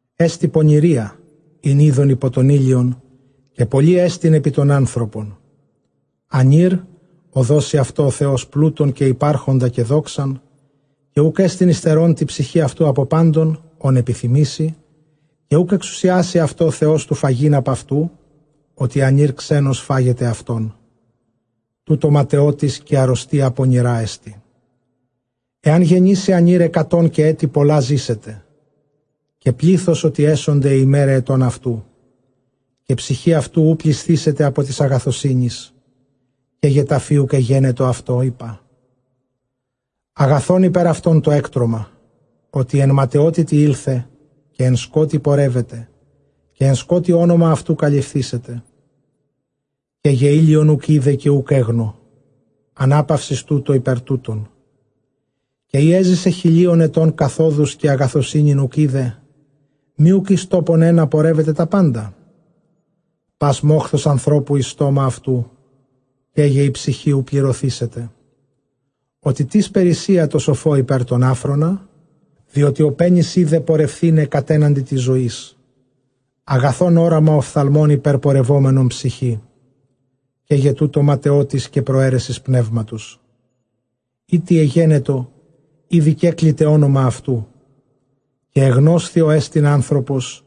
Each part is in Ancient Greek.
Ἔστι πονηρία ἣν εἶδον ὑπὸ τὸν ἥλιον, καὶ πολλή ἐστιν ὑπὸ τὸν ἄνθρωπον· Ἀνὴρ ᾧ δώσει αὐτῷ ὁ Θεὸς πλοῦτον καὶ ὑπαρχοντα καὶ δόξαν, καὶ οὐκ ἔστιν ὑστερῶν τῇ ψυχῇ αὐτοῦ ἀπὸ πάντων ὧν ἐπιθυμήσει, καὶ οὐκ ἐξουσιάσει αὐτῷ ὁ Θεὸς τοῦ φαγεῖν ἀπʼ αὐτοῦ, ὅτι ἀνὴρ ξένος φάγεται αὐτόν· τοῦτο ματαιότης καὶ ἀῤῥωστία πονηρά ἐστιν. Ἐὰν γεννήσῃ ἀνὴρ ἑκατόν, καὶ ἔτη πολλὰ ζήσεται, καὶ πλῆθος ὅ, τι ἔσονται αἱ ἡμέραι ἐτῶν αὐτοῦ, καὶ ψυχὴ αὐτοῦ οὐ πλησθήσεται ἀπὸ τῆς ἀγαθωσύνης, καί γε ταφὴ οὐκ ἐγένετο αὐτῷ, εἶπα, ἀγαθὸν ὑπὲρ αὐτὸν τὸ ἔκτρωμα. Ὅτι ἐν ματαιότητι ἦλθε, καὶ ἐν σκότει πορεύεται, καὶ ἐν σκότει ὄνομα αὐτοῦ καλυφθήσεται· Καί γε ἥλιον οὐκ εἶδε, καὶ οὐκ ἔγνω ἀναπαύσεις, τούτῳ ὑπὲρ τοῦτον· Καὶ ἔζησε χιλίων ἐτῶν καθόδους, καὶ ἀγαθωσύνην οὐκ εἶδε, μὴ οὐκ εἰς τόπον ἕνα πορεύεται τὰ πάντα; Πᾶς μόχθος ἀνθρώπου εἰς στόμα αὐτοῦ, καί γε ἡ ψυχὴ οὐ πληρωθήσεται. Ὅτι περίσσεια τῷ σοφῷ ὑπὲρ τὸν ἄφρονα, διότι ὁ πένης οἶδε πορευθῆναι κατέναντι τῆς ζωῆς. Ἀγαθὸν ὅραμα ὀφθαλμῶν ὑπερπορευόμενον ψυχῇ· καί γε τοῦτο ματαιότης καὶ προαίρεσις πνεύματος. Εἰ τι ἐγένετο, ἤδη κέκληται ὄνομα αὐτοῦ, καὶ ἐγνώσθη ὅ ἐστιν ἄνθρωπος,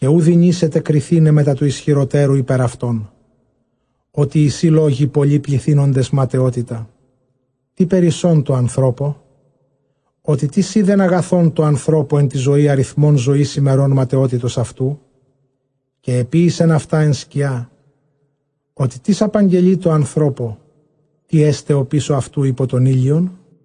καὶ οὐ δυνήσεται κριθῆναι μετὰ τοῦ ἰσχυροτὲρου ὑπὲρ αὐτόν. Ὅτι εἰσι λόγοι πολλοὶ πληθύνοντες ματαιότητα. Τί περισσὸν τῷ ἀνθρώπῳ; ὅτι τίς οἶδεν ἀγαθὸν τῷ ἀνθρώπῳ ἐν τῇ ζωῇ, ἀριθμὸν ζωῆς ἡμερῶν ματαιότητος αὐτοῦ; καὶ ἐποίησεν αὐτὰ ἐν σκιᾷ· ὅτι τίς ἀπαγγελεῖ τῷ ἀνθρώπῳ, τί ἔσται ὀπίσω αὐτοῦ ὑπὸ τὸν ἥλιον;